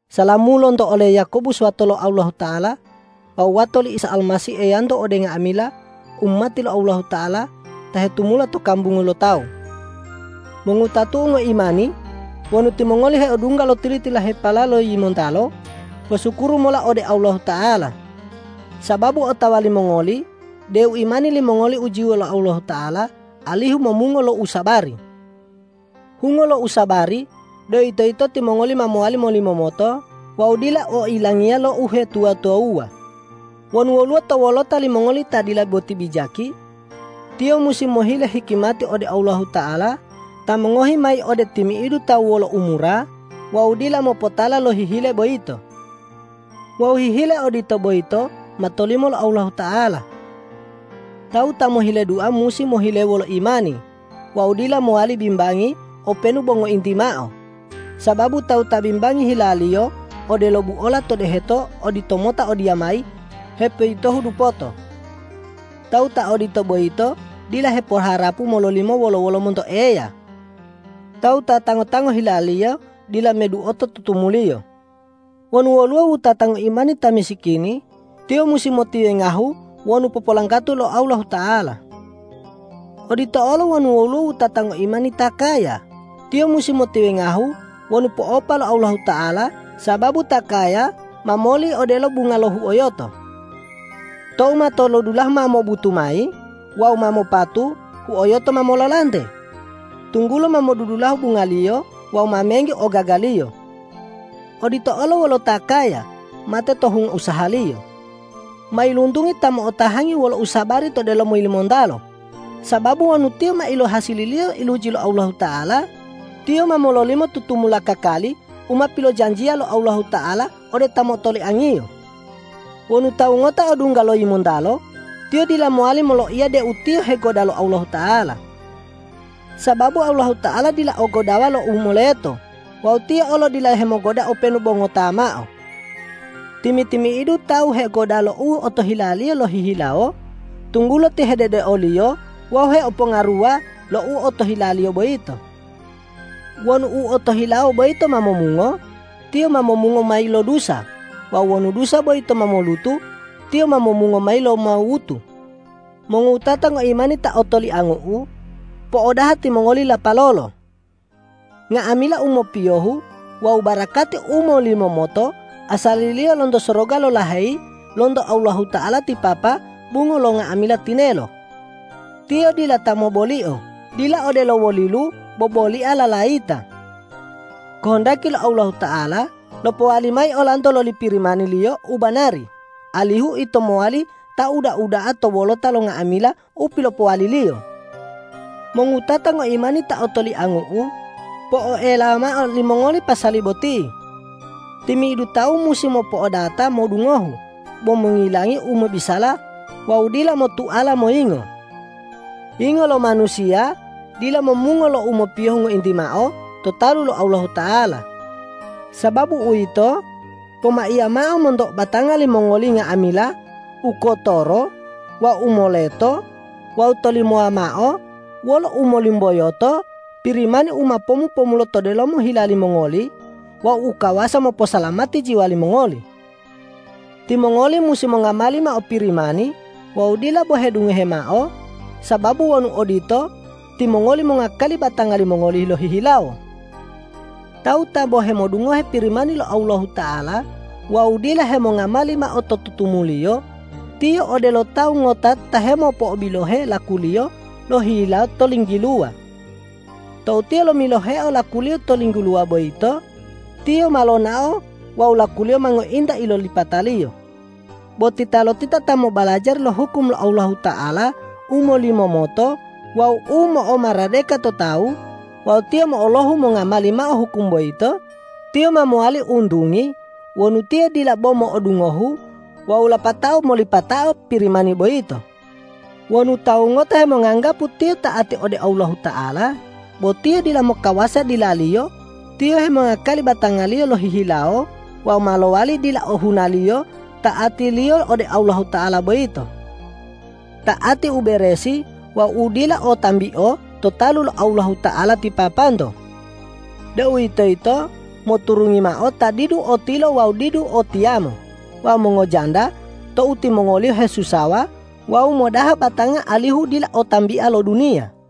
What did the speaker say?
Salamu lonto ole Yakobus wato lo Allahuta'ala wawu wato li Isa Almasih Eyanto ode nga'amila umati lo Allahuta'ala ta hetumula to kambungu lo tawu. Mongowutatu'u ngoimani! Wonu timongoli heodungga lo tili-tililahepala lo yimontalo, posukuru mola ode Allahuta'ala, sababu otawa limongoli deu imani limongoli ujiyo lo Allahuta'ala alihu momungo lo usabari. Hungo lo usabari, deuwitoyito timongoli ma mowali molimomoto wawu dila oilangiya lo uhetuwa-tuwawuwa. Wonu woluwo to wolota limongoli ta dila boti bijaki, tiyo musi mohile hikimati ode Allahuta'ala ta mongohi mayi ode timi'idu tawu wolo umura wawu dila mopotala lo hihile boyito. Wawu hihile odito boyito ma tolimo lo Allahuta'ala. Tawu ta mohile dua musi mohile wolo imani wawu dila mowali bimbangi openu bo ngointi mao, sababu tawu ta bimbangi hilaliyo odelo buola to deheto oditomota odiyamayi hepoyitohu dupoto. Tawu ta odito boyito dila hepoharapu mololimo wolo-wolo monto Eya. Tawu ta tango-tango hilaliyo dila meduoto tutumuliyo. Wonu woluwo wutata ngoimani ta misikini, tiyo musi motiwengahu wonu popolanggato lo Allahuta'ala. Odito olo wonu woluwo wutata ngoimani ta kaya, tiyo musi motiwengahu wonu po'opa lo Allahuta'ala sababu ta kaya ma moli odelo bunga lo huoyoto. Tou matolodulahu ma mobutu mayi wawu ma mopatu, huoyoto ma mololante, tunggulo ma modudulahu bungaliyo wawu ma menggi ogagaliyo. Odito olo wolo ta kaya, mate to hungo usahaliyo. Mailuntungi ta mo'otahangi wolo usabari to delomo yimontalo, sababu wonu tiyo ma ilohasililiyo iluji lo Allahuta'ala, tiyo ma mololimo tutumula kakali u ma pilojanjiya lo Allahuta'ala ode ta motoliang-Iyo. Wonu tawu ngota odungga lo yimontalo, tiyo dila mowali moloiya deu tiyo hegoda lo Allahuta'ala. Sababu Allahuta'ala dila o godawa lo u moleto wawu Tiyo olo dila hemogoda openu bo ngota mao. Timi-timi'idu tawu hegoda lo u otohilaliyo lohihilawo, tunggulo tiyo hededeoliyo wawu heopongaruwa lo u otohilaliyo boyito. Wonu u otohilawo boyito ma momungo, tiyo ma momungo mayi lo dusa wawu wonu dusa boyito ma molutu, tiyo ma momungo mayi lo mawutu. Mongowutata ngoimani ta otoliangu'u, po'odaha timongoli lapalolo. Nga'amila u mopiyohu wawu barakati u molimomoto asaliliyo lonto soroga lolaheyi lonto Allahuta'ala ti Papa bungo lo nga'amila tinelo. Tiyo dila ta mobolio, dila odelo wolilu bobolia lalayita. Kohondaki lo Allahuta'ala lopowali mayi olanto loli Pirimani-Liyo u banari, alihu ito mowali ta uda-uda'a to wolota lo nga'amila u pilopowali-Liyo. Mongowutata ngoimani ta otoliangu'u, po'oelawa mao limongoli pasali boti: Timi'idu tawu musi mopo'odata modungohu bo mongilangi u mobisala wawu dila motuala moyingo. Yingo lo manusiya dila momungo lo u mopiyohu ngointi mao to talu lo Allahuta'ala. Sababu uwito, pomaiya mao monto batanga limongoli nga'amila u kotoro wawu u moleto wawu tolimowa mao wolo umolumboyoto Pirimani u ma pomu-pomulo to delomo hila limongoli wawu u kawasa moposalamati jiwa limongoli. Timongoli musi mongamali mao Pirimani wawu dila bo hedungohe mao, sababu wonu odito, timongoli mongakali batanga limongoli lohihilawo. Tawu ta bo hemodungohe Pirimani lo Allahuta'ala wawu dila hemongamali mao to tutumuliyo, tiyo odelo tawu ngota ta hemopo'obilohe lakuliyo lohihilawo to linggiluwa. Tou tiyo lomiloheo lakuliyo to linggiluwa boyito, tiyo ma lonao wawu lakuliyo ma ngointa ilolipataliyo. Bo titalotita ta mobalajari lo hukum lo Allahuta'ala u molimomoto wawu u mo'omaradeka to tawu wawu tiyo mo'olohu mongamali mao hukum boyito, tiyo ma mowali untungi wonu tiyo dila bo modungohu wawu lapatao molipatao Pirimani boyito. Wonu tawu ngota hemonganggapu tiyo ta'ati ode Allahuta'ala bo tiyo dila mokawasa dilaliyo, tiyo hemongakali batangaliyo lohihilawo wawu ma lowali dila ohunaliyo ta'atiliyo ode Allahuta'ala boyito. Ta'ati u beresi wawu u dila o tambio to talu lo Allahuta'ala ti Papanto, deuwitoyito moturungi mao ta didu o tilo wawu didu o tiyamo wawu mongojanda tou timongoliyo hesusawa wawu modaha batanga alihu dila o tambia lo duniya.